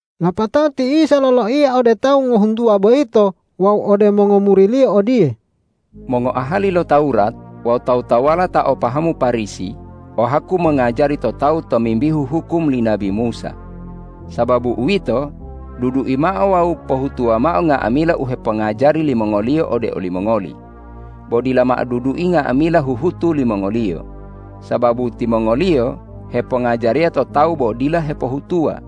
Lapatao ti Isa loloiya ode tawu ngohuntuwa boyito wawu ode mongomuri-Liyo odiye, ”Mongoahali lo Tawurat wawu tawu-tawuwala ta o pahamu Parisi o haku mongajari to tawu tomimbihu hukum li nabi Musa. Sababu uwito, dudui mao wawu pohutuwa mao nga'amila u hepongajari limongoliyo ode olimongoli. Bo dila mao dudui nga'amila huhutu limongoliyo, sababu timongoliyo hepongajariya to tawu bo dila hepohutuwa.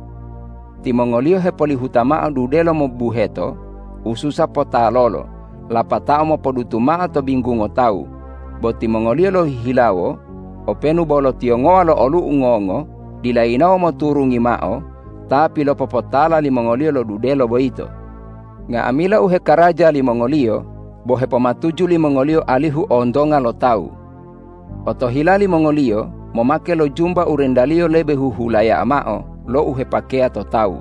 Timongoliyo hepolihuta mao dudelo mobubuheto u susa potalolo lapatao mopodutu mao to binggungo tawu, bo timongoliyo lohihilawo openu bo lo tiyongowa lo olu'u ngongo dila yinawo moturungi mao ta pilopopotala limongoliyo lo dudelo boyito. Nga'amila u hekaraja limongoliyo bo hepomatuju limongoliyo alihu ontonga lo tawu. Otohila limongoliyo momake lo jumba u rendaliyo lebe huhulaya'a mao lo u hepakeya to tawu.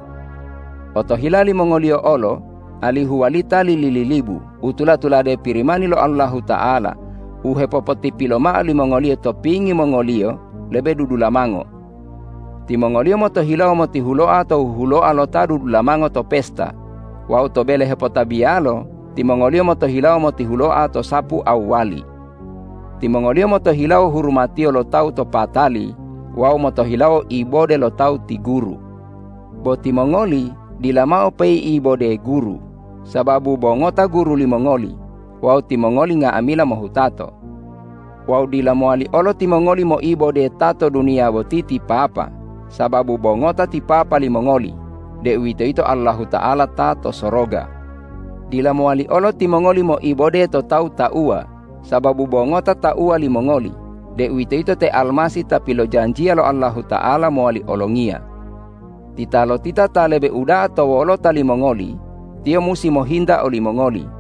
Otohila limongoliyo olo alihu walita lili-lilibu u tula-tulade Pirimani lo Allahuta'ala u hepopotipilo mao limongoliyo to pingi mongoliyo lebe dudulamango. Timongoliyo motohilawo motihuloa to huhuloa lo ta dudulamango to pesta wawu to bele hepotabiyalo timongoliyo motohilawo motihuloa to sapu awwali. Timongoliyo motohilawo hurumatiyo lo tawu to patali wawu motohilawo ibode lo tawu ti guru. Bo timongoli dila mao pei'ibode guru, sababu bo ngota Guru limongoli wawu timongoli nga'amila mohutato. Wawu dila mowali olo timongoli moibode ta to duniya boti ti papa, sababu bo ngota ti Papa limongoli, deuwitoyito Allahuta'ala ta to soroga. Dila mowali olo timongoli moibode to tawu tauwa, sababu bo ngota Tauwa limongoli, deuwitoyito te Almasih ta pilojanjiya lo Allahuta'ala mowali olongiya. Titalotita ta lebe uda'a to wolota limongoli, tiyo musi mohinta olimongoli.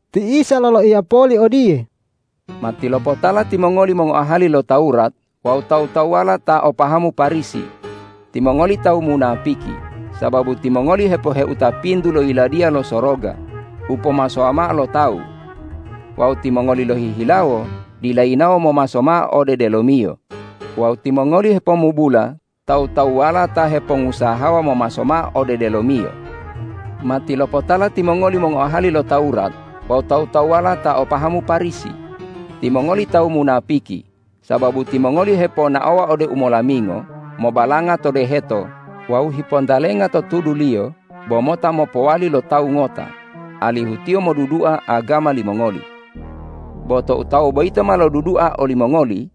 Ti Isa loloiya poli odiye,”Matilopotala timongoli mongoahali lo Tawurat wawu tawu-tawuwala ta o pahamu Parisi, timongoli tawu munapiki, sababu timongoli hepoheuta pintu lo Yiladiya lo Soroga u pomasowa mao lo tawu. Wawu timongoli lohihilawo dila yinawo momaso mao ode delomiyo wawu timongoli hepomubula tawu-tawuwala ta hepongusahawa momaso mao ode delomiyo. Matilopotala timongoli mongoahali lo Tawurat wawu tawu-tawuwala ta o pahamu Parisi, timongoli tawu munapiki, sababu timongoli heponaowa ode umolamingo mobalanga to deheto wawu hipontalenga to tuduliyo bo mota mopowali lo tawu ngota, alihu tiyo modudua agama limongoli. Bo tou tawu boyito ma lodudua olimongoli,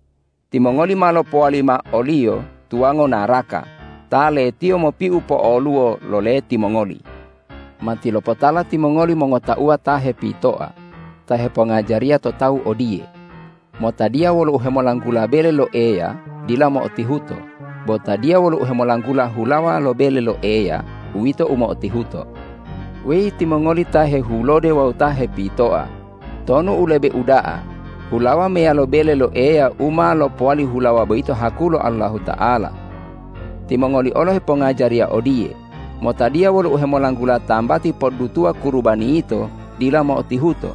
timongoli ma lopowali mao oliyo tuwango naraka ta letiyo mopiu po'oluwo lo leti mongoli. Matilopotala timongoli mongotauwa ta hepitoa ta hepongajariya to tawu odiye: Motadiya wolo uhemolanggula bele lo Eya, dila mo'otihuto; bo tadiya wolo uhemolanggula hulawa lo bele lo Eya, uwito u mo'otihuto. Weyi timongoli ta hehulode wawu ta hepitoa, tonu u lebe uda'a hulawa meyalo bele lo Eya u ma lopowali hulawa boyito haku lo Allahuta'ala? Timongoli olo hepongajariya odiye: Motadiya wolo uhemolanggula tambati poddutuwa kurubani yito, dila mo'otihuto;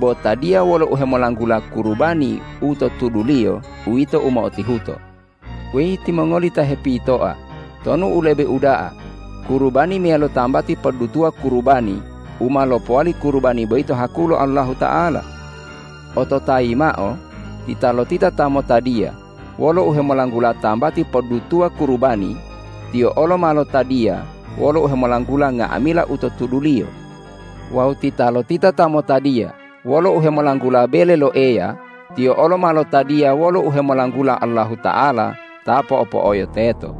bo tadiya wolo uhemolanggula kurubani u to tuduliyo, uwito mo'otihuto. Weyi timongoli ta hepitoa, tonu u lebe uda'a kurubani meyalo tambati poddutuwa kurubani u ma lopowali kurubani boyito haku lo Allahuta'ala? Ototayi mao: Titalotita ta motadiya wolo uhemolanggula tambati poddutuwa kurubani, tiyo olo ma lotadiya wolo uhemolanggula nga'amila u to tuduliyo. Wawu titalotita ta motadiya wolo uhemolanggula bele lo Eya, tiyo olo ma lotadiya wolo uhemolanggula Allahuta'ala ta po'o-po'oyo teto.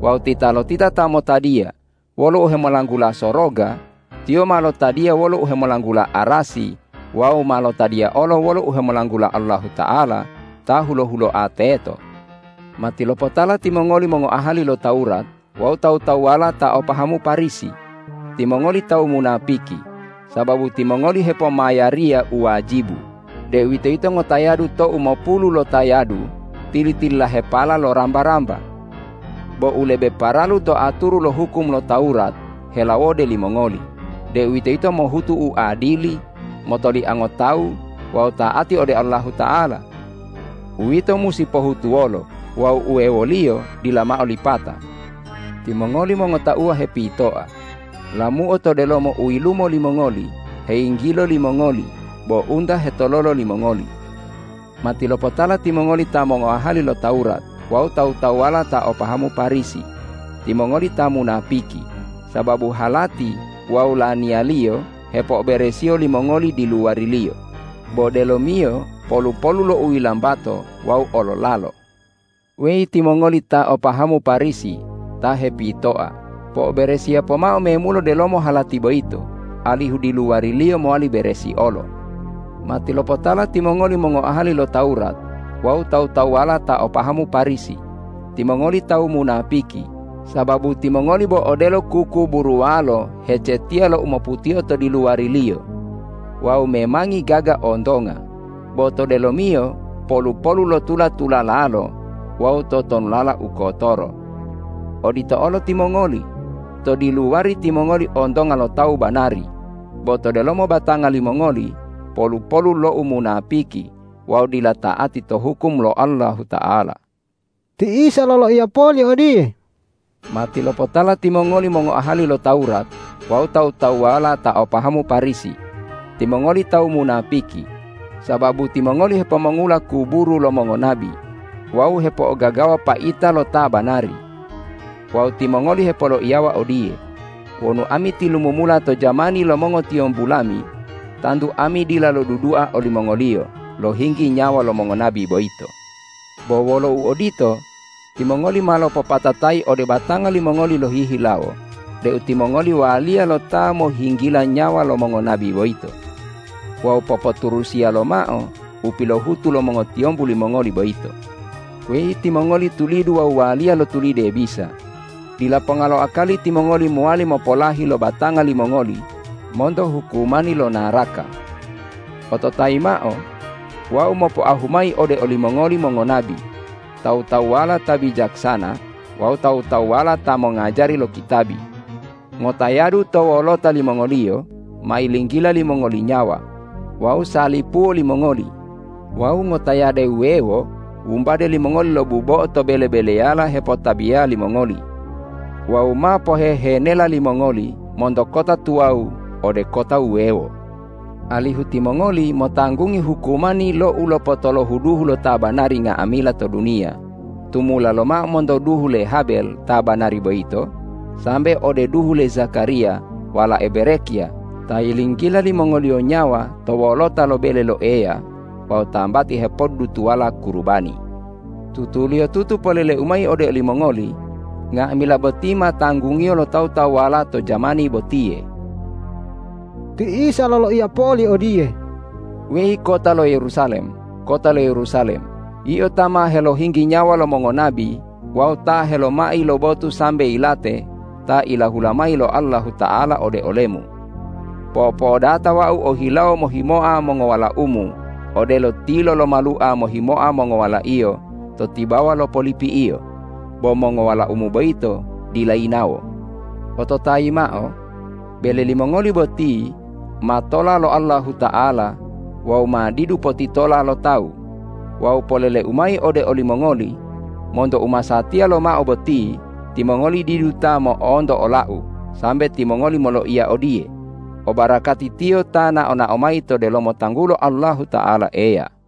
Wawu titalotita ta motadiya wolo uhemolanggula soroga, tiyo ma lotadiya wolo uhemolanggula arasi wawu ma lotadiya olo wolo uhemolanggula Allahuta'ala ta hulo-huloa teto. Matilopotala timongoli mongoahali lo Tawurat wawu tawu-tawuwala ta o pahamu Parisi, timongoli tawu munapiki, sababu timongoli hepomayariya u wajibu, deuwitoyito ngotayadu to umopulu lotayadu tili-tililahepala lo ramba-ramba. Bo u lebe paralu to aturu lo hukum lo Tawurat helawode limongoli, deuwitoyito mohutu u adili, motoliango tawu wawu ta'ati ode Allahuta'ala. Uwito musi pohutuwolo wawu uwewoliyo dila mao lipata. Timongoli mongotauwa hepitoa, lamuo to delomo u yilumo limongoli heyinggilo limongoli bo unta hetololo limongoli. Matilopotala timongoli ta mongoahali lo Tawurat wawu tawu-tawuwala ta o pahamu Parisi, timongoli ta munapiki, sababu halati wawu laniyaliyo hepo'oberesiyo limongoli diluwariliyo, bo delomiyo polu-polu lo uyilambato wawu ololalo. Weyi timongoli tawu ta o pahamu Parisi ta hepitoa, po'oberesiya pomao memulo delomo halati boyito alihu diluwariliyo mowali beresi olo. Matilopotala timongoli mongoahali lo Tawurat wawu tawu-tawuwala ta o pahamu Parisi, timongoli tawu munapiki, sababu timongoli bo odelo kukuburuwalo hecetiya lo u moputio to diluwariliyo wawu memangi gaga ontonga, bo to delomiyo polu-polu lo tula-tulalalo wawu totonulala u kotoro. Odito olo timongoli, to diluwari timongoli ontonga lo tawu banari bo to delomo batanga limongoli polu-polu lo umunapiki wawu dila ta'ati to hukum lo Allahuta'ala.” Ti Isa loloiya poli odiye,”Matilopotala timongoli mongoahali lo Tawurat wawu tawu-tawuwala ta o pahamu Parisi, timongoli tawu munapiki, sababu timongoli hepomongula kuburu lo mongonabi wawu hepo'ogagawa paita lo ta banari. Wawu timongoli hepoloiyawa odiye: Wonu ami tilumumula to jamani lo mongotiyombu lami, tantu ami dila lodudua olimongoliyo lo- hinggi nyawa lo mongonabi boyito. Bo wolo uodito, timongoli ma lopopatatayi ode batanga limongoli lohihilawo deu timongoli waliya lo ta mohinggila nyawa lo mongonabi boyito. Wawu popoturusiya lomao u pilohutu lo mongotiyombu limongoli boyito. Weyi timongoli tulidu wawu waliya lo tulide bisa, dila ponga lo akali timongoli mowali mopolahi lo batanga limongoli monto hukumani lo naraka. Ototayi mao: Wau mopoahu mayi ode olimongoli mongonabi, tawu-tawuwala ta bijaksana wawu tawu-tawuwala ta mongajari lo kitabi. Ngotayadu to wolota limongoliyo ma yinggila limongoli nyawa wawu salipuwo limongoli wawu ngotayade wuwewo wumbade limongoli lo bubo'o to bele-beleyala hepotabiya limongoli wawu ma pohehenela limongoli monto kota tuwawu ode kota wuwewo, alihu timongoli motanggungi hukumani lo ulopotolohu duhu lo ta banari nga'amila to duniya tumula lomao monto duhu le Habel ta banari boyito, sambe ode duhu le Zakariya walae Berekya ta yilinggila limongoliyo nyawa to wolota lo bele lo Eya wawu tambati hepoddutuwala kurubani. Tutuliyotutu polele-U mayi ode olimongoli: Nga'amila boti ma tanggungiyo lo tawu-tawuwala to jamani botiye!” Ti Isa loloiya poli odiye,”Weyi kota lo Yerusalem, kota lo Yerusalem, yio ta ma helohinggi nyawa lo mongonabi wawu ta helomai lo botu sambe yilate ta ilahula mayi lo Allahuta'ala ode olemu! Po'o-po'odata Wau ohilawo mohimoa mongowalaumu odelo tilo lo malua mohimoa mongowalaiyo to tibawa lo polipi'iyo, bo mongowalaumu boyito dila yinawo. Ototayi mao: Bele limongoli boti ma tola lo Allahuta'ala wawu ma didu potitola lo tawu. Wawu polele-U mayi ode olimongoli: Monto u masatiya lomao boti timongoli didu ta mo'onto ola-U sambe timongoli moloiya odiye, ’Obarakati Tiyo ta nao-nao mayi to delomo tanggulo Allahuta'ala Eya!’”